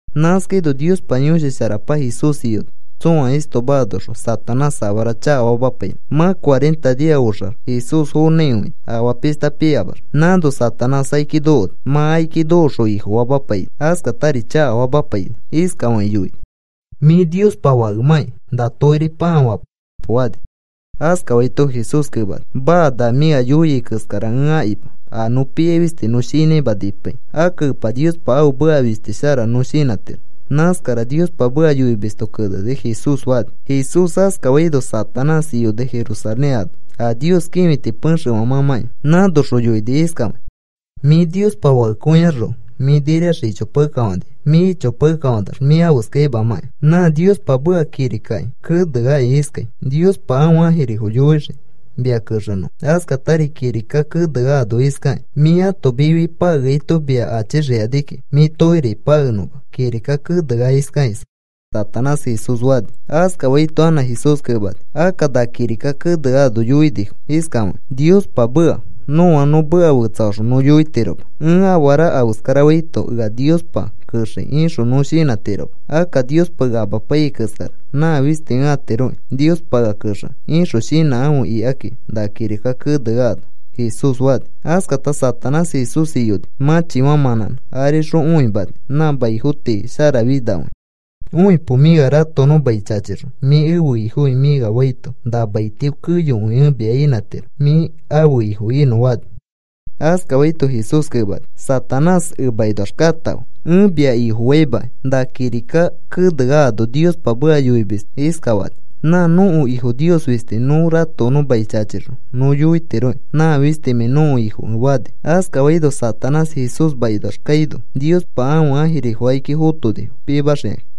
Nãskaino Niospa Yõshi Sharapa Jesús iyoni tsõa istoma anoxõ Satanás afara chakafamapainõ. Mã cuarenta nia oxax Jesús fonãikõini afaa pishta piyamax. Nãno Satanás akiki nokoni. Mã akiki nokoxõ ifofamapaini. Askatari chakafamapaini. Iskafakĩ yoini: “Mĩ Niospa Fakemãkĩ na tokirifo pãa fapo,” fani. Askafaito Jesús kemani: “Maa, na mĩ ea yoiai keskara ẽ akima. A nõ piai fisti nõ shinãima nipaikĩ. Akka Epa Niospa ãfe meka fisti shara nõ shinãtiro. Nãskara Niospa meka yoimisto keneni,” Jesús fani. Jesús askafaino Satanás iyoni Jerusalén ano a Nios kĩfiti pexefã mãmãkĩa. Nãnoxõ yoini iskafakĩ: “Mĩ Niospa Fakekõiaxroko mĩ niriax ichopakekafanikai. Mĩ ichopakekafanax mĩ afeskaimakai. Nã Niospa meka kirikaki keneaki iskai: ‘Niospa ãfe ãjirifo yoixii mia kexenõfo.’ Askatari kirika keneano iskaki: ‘Mĩ ãto mifiki pakeaito mia achixikani kiki mĩ tokiriki pakenõma,’ kirika kenea iskaki,” Satanás Jesús fani. Askafaito anã Jesús kemani: “Akka na kirika keneano yoinifo iskafakĩ Niospa meka: ‘Nõa nõ meka fetsafaxõ nõ yoitiroma: “Ẽ afara afeskarafaito, ea Niospa kexei,” ixõ nõ shinãtiroma. Akka, “Niospa ea amapaiyai keskara nã fisti ẽ atiroki Niospa ea kexenõ,” ixõ shinãkãfe,’ ikaki na kirika keneano,” Jesús fani. Askata Satanás Jesús iyoni mãchifã mãnãnẽ. Arixõ õimani nã maifo tii sharafinakõia. “Õipo. Mĩ ea ratokonõ mai chachixõ, ‘Mĩ ẽfe ifoki,’ mĩ ea faito na maitio keyokõi ẽ mia inãtiro mĩ ãfe ifo inõ,” fani. Askafaito Jesús kemani: “Satanás. Emakinoax katãfe. Ẽ mia ifofaimakai. Na kirika kenea ano Niospa meka yoimisto iskafani: ‘Nã nõko Ifo Nios fisti nõ ratokonõ mai chachixõ nõ yoitirokĩ, nã fistimãi nõko Ifokẽ,’” fani. Askafaino Satanás Jesús makinoax kaino Niospa ãfe ãjirifo akiki fotonifo pimaxikakĩ.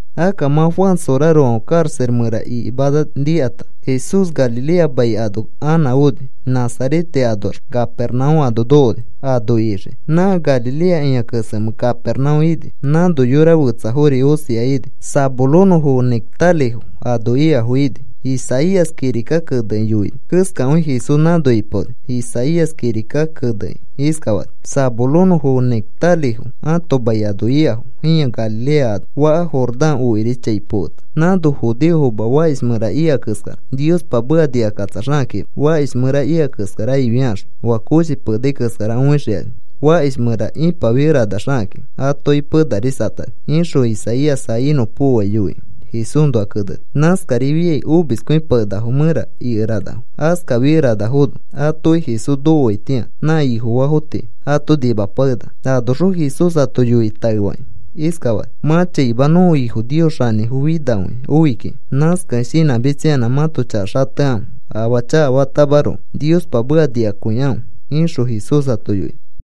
Akka mã Juan sorarofãfe karaxa mẽra ikimana nikata Jesús Galilea mai ano anã oni. Nazarete anoax Capernaúm ano nokoni ano ixiki. Nã Galilea ĩa kesemẽ Capernaúm ini. Nãnori yora fetsafori osia ini. Zabulonõfo fe Neftalifo ano ikafo ini. Isaías kirika kenekĩ yoini keskakõi Jesús nãno ipaoni. Isaías kirika kenekĩ iskafani: Zabulonõfo fe Neftalifo ãto mai ano ikafo ĩa Galilea ano. Faka Jordán okiri chai poketa nãno judeofoma fakish mẽra ika keskara, Niospa meka nikakatsaxakakima. Fakish mẽra ika keskara ifiakaxõ, oa koshi penai keskara õixikani. Fakish mẽra ipafikeranaxakakĩ atoki penarisatani, ixõ Isaías a inõpokoai yoikĩ Jesúsnoa keneni. Nãskarifiai omiskõipakenakafo mẽra ikeranafo. Askafikeranafono atoki Jesús nokoaitĩa nã Ifofaafo tii ato nimapakenaka. Anoxõ Jesús ato yoikĩ taefakĩ iskafani: “Mã chaima nõko Ifo Nios xanĩfo finakõia oi kiki. Nãskakẽ shinãmitsayanã mãto chaka xatekãfe. Afaa chakafatamaroko Niospa meka nikakõikãfe,” ixõ Jesús ato yoini.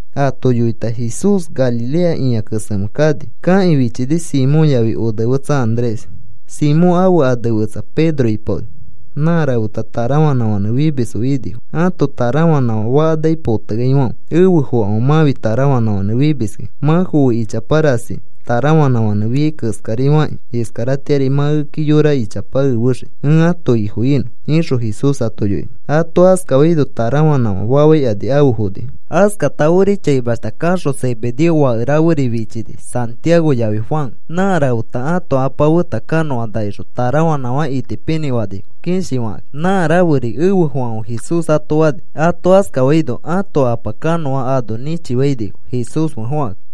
Ato yoita Jesús Galilea ĩa kesemẽ kani. Kakĩ fichini Simón yafi onefetsa Andrés. Simón ãfe ane fetsa Pedro ipaoni. Nã rafeta tarafanãfãnẽ fimisfo inifo, ãto tarafanãfã faka naki poteaifãfe. “Efe fokãfe. Mãfi tarafanãfãnẽ fimiskĩ. Mã foe ichapa rasi tarafanãfãnẽ fiai keskari fakĩ iskaratĩari mã ekeki yora ichapa efexii ẽ ãto Ifo inõ,” ixõ Jesús ato yoini. Ato askafaino tarafanãfã fafaikani afe fonifo. Askata ori chaimashta kaxõ Zebedeo fake raferi fichini, Santiago yafi Juan. Nã rafeta ãto apa feta kanõa nakixõ tarafanãfã itipinĩ fanifo, kishifakãkĩ. Nã raferi, “Efe fokãfe,” Jesús ato fani. Ato askafaino ãto apa kanõa ano nĩchifainifo Jesús fe fokakĩ.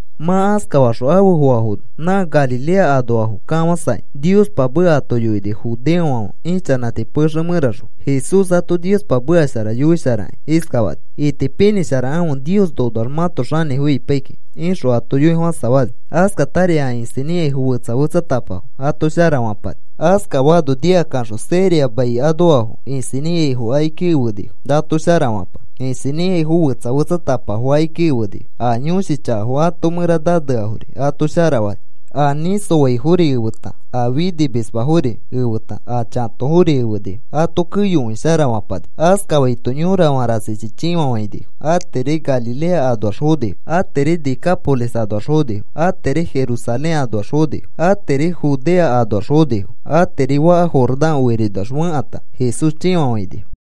Mã askafaxõ afe foafono nã Galilea anoafo kafãsakĩ Niospa meka ato yoini. Judeofãfe ichanãti pexe mẽraxõ Jesús ato Niospa meka shara yoisharakĩ iskafani: “Itipinĩsharakãfe. Nios nonoax mãto xanĩfo ipai kikĩ,” ixõ ato yoifofãsafani. Askatari a isinĩ ikaifo fetsa fetsatapafo ato sharafãpani. Askafaano nikakaxõ Siria mai anoafo isinĩ ikaifo akiki efenifo ato sharafapanõ. Isinĩ ikaifo fetsa fetsatapafo akiki efenifo. A yõshi chaka ãto mẽra naneafori ato sharafani. A nĩsoaifori efeta, a finimismafori efeta, a chatofori efenifo. Ato keyokõi sharafapani. Askafaito yorafã rasichi chĩfafainifo. Atiri Galilea anoax fonifo, atiri Decápolis anoax fonifo, atiri Jerusalén anoax fonifo, atiri Judea anoax fonifo, atiri faka Jordán okirinoax fekãta Jesús chĩfafainifo.